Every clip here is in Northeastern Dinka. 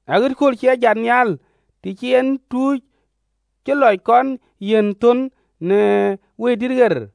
aɣet kööl cï e jat nhial, të cï en tuuc cï lɔc kɔn yiɛ̈n thön në Wëidït ɣer: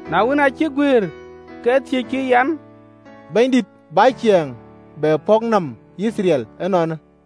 Na wën, aa cïk guëër, ke thiëckï an, “Bɛ̈nydït, bä Ciɛɛŋ bɛ pɔ̈k nɔm Yithriɛl ënɔɔnë?”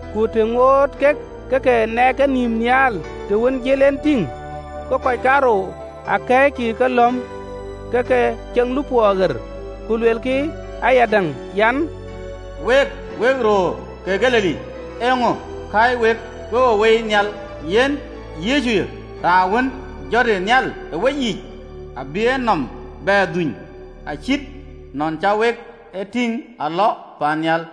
Ku të ŋoot kek ë ke nɛɛk kenïïm nhial të wën jël en, gokï kɔc kaarou tïŋ akɛ̈ɛ̈ckï ë kelɔ̈m ke ke ceŋ lupɔɔ ɣer, ku luelkï ayadäŋ, an, “Wek röör ke Galili, eeŋö kääc wek ke we woi nhial? Yen Yecuyë, raan wën jɔtë nhial ë weyiic, abï enɔm bɛ dhuny acït nɔn cä wek e tïŋ alɔ paannhial.”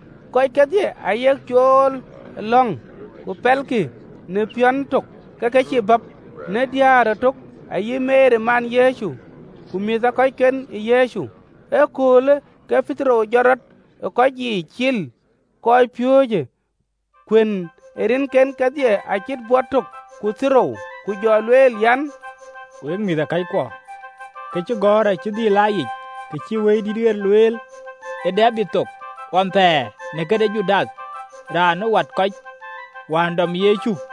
Kɔckë kedhie ayek cool ë lɔ̈ŋ ku pɛlkï në piɔ̈n tök, ke ke cïï bäp, në diäär ëtök, ayï Meri man Yecu, ku mïthëkɔcken ë Yecu. Ë aköölkë ke Petero jɔt rɔt ë kɔc yiic cil kɔcpiööcë (kuën ë rinken kedhie acït bɔt tök ku thiërrou), ku jɔ lueel an, “Wek mïthëkɔckuɔ, këcïgɔ̈ɔ̈r acï dhil aa yic, kë cïï Wëidït ɣer luel ë Debid thok ɣɔn thɛɛr në këde Judath, raan ë wat kɔc wään dɔm Yecu.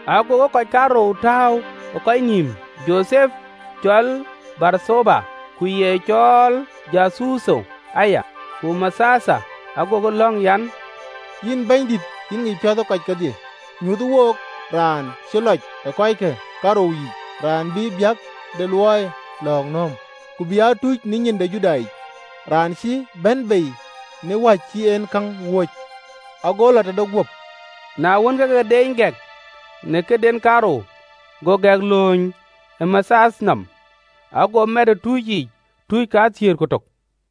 Agokï kɔc kaarou tääu ë kɔc nïïm, Jothep cɔl Barthaba, ku ye cɔɔl Juthutho aya, ku Mathiath. Agokï lɔ̈ŋ an, “Yïn Bɛ̈nydït, yïn ŋic piɔ̈n ë kɔc kedhie, nyuöthë wook raan cï lɔc ë kɔckë kaarou yiic, raan bï biäk de luɔiyë lɔ̈ɔ̈k nööm, ku bï aa tuc ë nyin ë Judathic, raan cï bɛ̈n bei në wäc cï en käŋ wööc, ago lɔ tëde guöp.” Na wën, ke ke deeny gɛk në këden kaarou, go gɛk lööny ë Mathiath nɔm, ago mɛt ë tuuc yiic tuuc kathiëër ku tök.